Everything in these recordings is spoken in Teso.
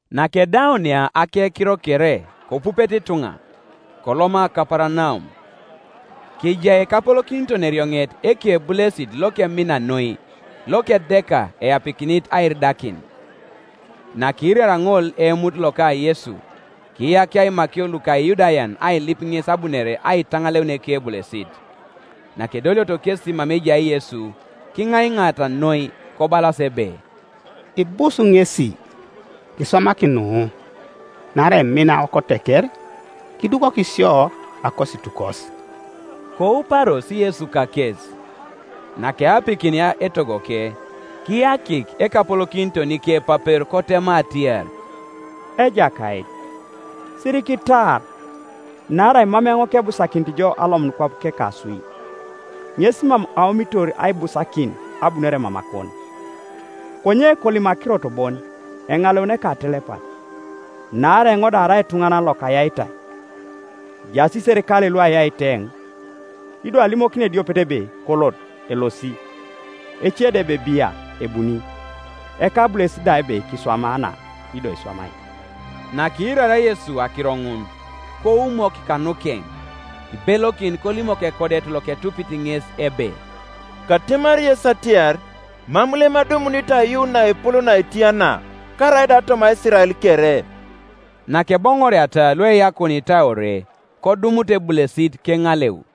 Nakedaunia akekiro kere kopupete ituŋa, koloma Kaparanaum. Kejai ekapolokiton-erioŋet ekebulesit lokemina noi, lokedeka eapikinit airidakin, Nakiiraria ŋol eemut loka Yesu, kiyakia imakio luka Iyudayan ailip ŋes abunore aitaŋaleun ekebulesit. Nakedolioto kesi mama ejai Yesu, kiŋaiŋaata noi, kobalas ebe, “Ibus ŋesi, kiswamaki nu: naarai emin awokoteker, kidukok sio akositukos.” Kouparos Yesu kakes, Nakeapikinia etogoke, kiyakik ekapolokiton ikepapero kotema atiar, “Ejakait, sirikitaar: naarai mam eoŋ kebusakinit jo alomun kwap kekaswi. Ŋes mam aomitor aibusakin abunore mamakon: konye kolim akirot bon, eŋaleuni ekatelepat. Naarai eoŋ da arai etuŋanan lokayaitai, ejaas iserikalei luayait eoŋ: ido alimokini ediopet ebe, ‘Kolot’, elosi; ece da ebe, ‘Bia,’ ebuni; ekabulesit da ebe, ‘Kiswama na,’ ido iswamai.” Nakiiraria Yesu akiro ŋun, koumok kanukeŋ, kibelokin kolimok ekodet loketupit ŋes ebe, “Katemari yes atiar, Mam lem adumunit aiyuun naepol naetia na, karaida toma Isirael kere.” Nakeboŋoriata lueyakunitai ore, kodumut ebulesit keŋaleu.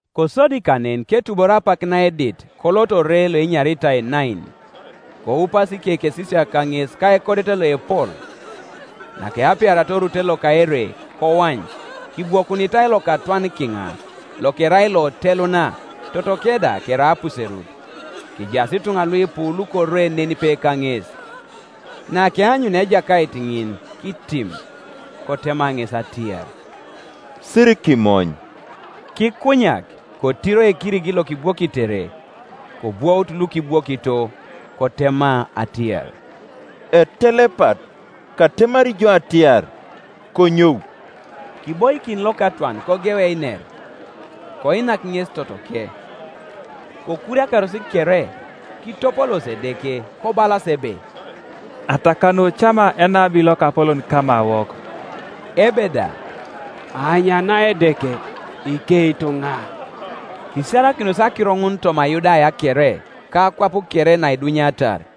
Kosodi kanen ketubor apak naedit kolot ore loenyaritai Nain, koupas ikekesisiak kaŋes ka ekodet loepol. Nakeapiaria orute loka ere, koany, kibwokunitai lokatwan kiŋa, lokerai loteluna, totoke da kerai apuserut: kejaas ituŋa luipu lukore nenipe kaŋes. Nakeanyunia Ejakait ŋin kitim, kotema ŋes atiar, “Sirikimony.” Kikunyak kotiro ekirigi lokibwokitere, kobwout lukibwokito. Kotema atiar, “Etelepat, katemari jo atiar, Konyou.” Kiboikin lokatwan kogeu einer. Koinak ŋes totoke. Kokuriakaros kere; kitopoloosi Edeke, kobalas ebe, “Atakanu cama enabi lokapolon kamawok!” ebe da, “Aanyana Edeke iketuŋol” Kisiarakinos akiro ŋun toma Yudaya kere, ka akwap kere naidunyatar.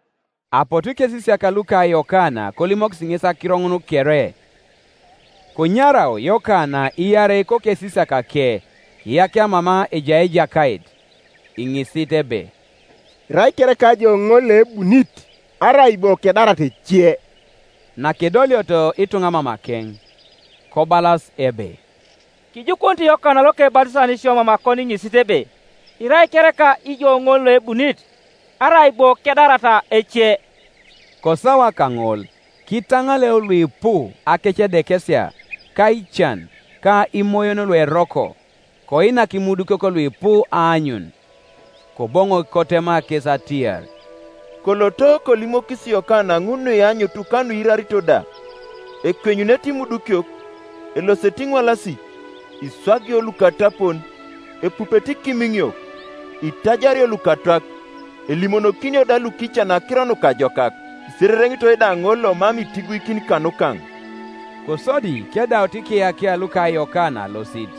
Apotu ikesisiak luka Yokana kolimokis ŋes akiro ŋun kere. Kenyarau Yokana iarei kokesisiakake kiyakia mama ejai Ejakait, iŋisit ebe, “Irai kereka ijo ŋol loebunit, arai bo kedarata ece?” Nakedolioto ituŋa mamakeŋ, kobalas ebe, “Kijukunit Yokana Lokebatisan sio mamakon iŋisit ebe, ‘Irai kereka ijo ŋol Iocbunit, arai bo kedarata ece?’” Kosawa kaŋol kitaŋaleu luipu akecedekesia, ka ican ka imoyon lueroko; koinak imudukiok luipu aanyun. Koboŋok kotema kes atiar, “Koloto, kolimokis Yokana ŋun nuianyut ka nuiirarito da; ekwenyunete imudukiok, elosete iŋwalasik, iswagio lukatapon, epupete ikimiŋiok, itajario lukatwak, elimonokinio da lukican akiro nukajokak. Isirereŋitoi da ŋol lomam itiguikin kanukaŋ.” Kosodi kedaut ikiyakia luka Yokana alosit,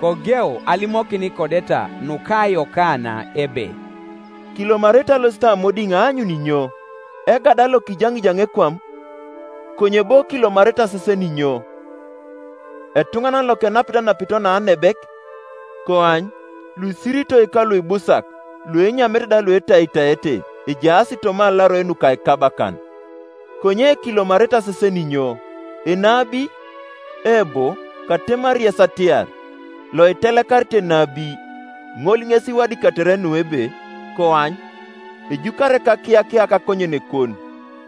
kogeu alimokin ikodeta nuka Yokana ebe, “Kilomarete alosit amodiŋ aanyun inyo? Egada lokijaŋijaŋ! ekwam? Konye bo kilomarete asesen inyo? Etuŋanan lokenapit anapito naanebek? Koany, luisiritoi kaluibusak, luenyamete da luetaitaete, ejaas toma alaroi nuka ikabakan. Konye kilomarete asesen inyo? Enabi? Eebo, katemari yes atiar, loitelekarit enabi. Ŋol ŋes iwadikatere nu ebe, ‘Koany, ejukari ekakiyakia kakonyenekon,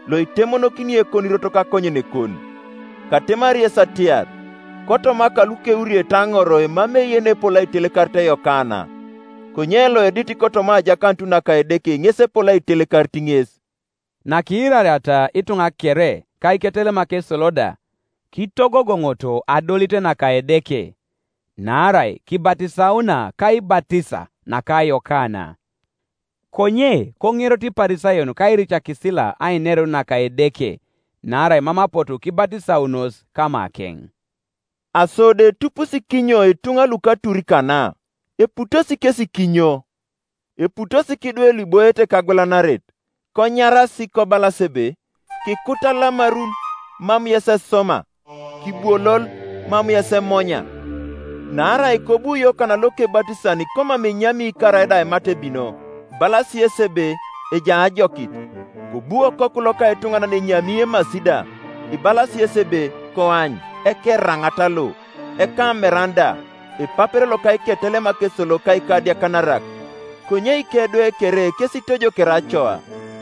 Loitemonokini ekonirot kakonyenekon.’ Katemari yes atiar, Kotoma lukeuriete aŋor emamei yenepol aitelekarit Yokana: konye loedit kotoma ajakanut naka Edeke ŋes epol aitelekarit ŋes.” (Nakiirariata ituŋa kere, ka iketelemak esolo da, kitogogoŋoto adolit naka Edeke, naarai kibatisauna kaibatisa naka Yokana. Konye koŋeroto Iparisayon ka iricakisila ainerun naka Edeke, naarai mam apotu kibatisaunos kamakeŋ.) “Aso do etupusi kinyo ituŋa luka atur kana, eputosi kesi kinyo? Eputosi kidwe luiboiete kagwelanaret, konyaras, kobalas ebe, ‘Kikut alamarun, mam yes esoma; Kibwolol, mam yes emonya.’ Naarai kobu Yokana Lokebatisan komam enyami karaida aimat ebino; ibalasi yesi ebe, ‘Ejai ajokit’. Kobu Okoku loka etuŋanan enyami emasi da; ibalasi yesi ebe, ‘Koany, ekeraŋat lo, ekameran da, epapero loka iketelemak esolo ka ikadiakanarak!’ Konye ikedwe kere kes itojokere Acoa.”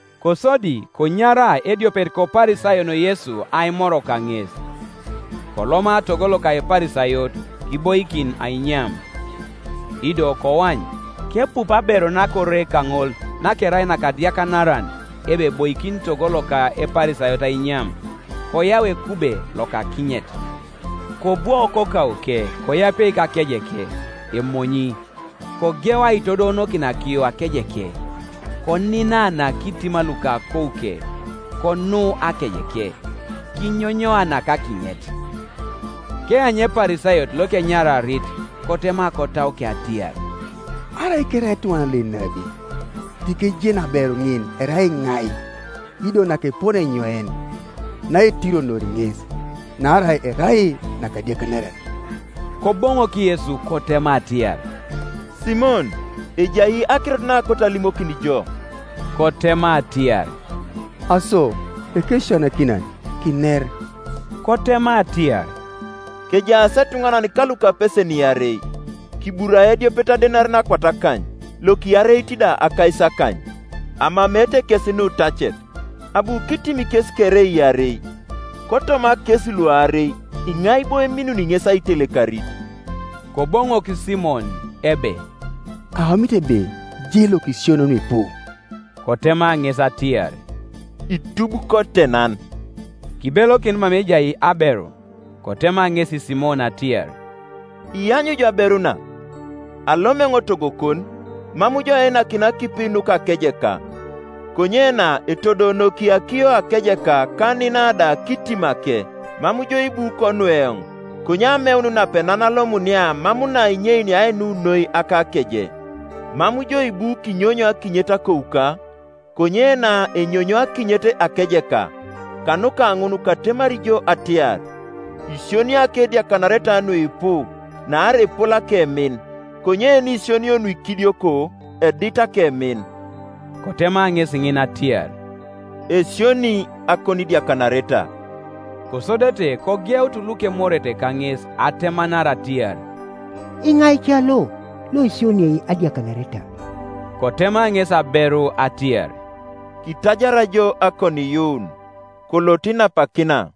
Kosodi konyara ediopet koParisayon Yesu aimor kaŋes. Koloma togo loka Eparisayot, kiboikin ainyam. Ido koany, kepupu aberu nakore kaŋol, nakerai nakadiakanaran ebe eboikin togo loka Eparisayot ainyam, koyau ekube loka akinyet; kobwo kokauke koapie kakejeke, emonyi, kogeu aitodoonokin akiyo akejeke, koninana kitima luka akouke, konu akejeke, kinyonyoanak akinyet. Keanyu Eparisayot lokenyararit, kotema kotauke atiar, “Arai kerai etuŋanan lo enabi, tikejenu aberu ŋin erai iŋai, ido nakepone enyoin, naetironori ŋes, naarai erai nakadiakanaran.” Koboŋok Yesu kotema atiar, “Simon, ejai akirot naakoto alimokin jo.” Kotema atiar, “Aso, Ekesisianakinan, kiner.” Kotema atiar, “Kejaas etuŋanan kalukapesen iarei; kiburai ediopet adenarin akwat akany, lokiareit da akaisakany. Amameete kes nutacet, abu kitim kes kere iarei. Kotoma kes luarei, iŋai bo eminuni ŋes aitelekarit?” Koboŋok Simon ebe, “Aomit ebe je lokisionio nuipu.” Kotema ŋes atiar, “Itub kotenan.” Kibelokin mama ejai aberu kotema ŋesi Simon atiar, “Iany ijo aberu na? Alom eoŋ togokon, mam jo einakina akipi nuka akejeka, konye na etodoonoki akiyo akejeka ka anina da kitimake. Mam jo ibu konu eoŋ, konye ameun napenan alomunia mam na inyeina ainu noi akakeje. Mam jo ibu kinyonyo akinyet akouka, konye na enyonyo akinyet akejeka, Kanuka ŋun katemari jo atiar, Isionio akediakanareta nuipu, naarai epol akemin; konye yenisionio nuikidioko, edit akemin.” Kotema ŋesi ŋin atiar, “Esionii akonidiakanareta.” Kosodete kogeutu lukemorete kaŋes atemanar atiar, “Iŋai ca lo, loisioniei adiakanareta?” Kotema ŋesi aberu atiar, “Kitajar jo akoniiyuun; kolot inapakina.”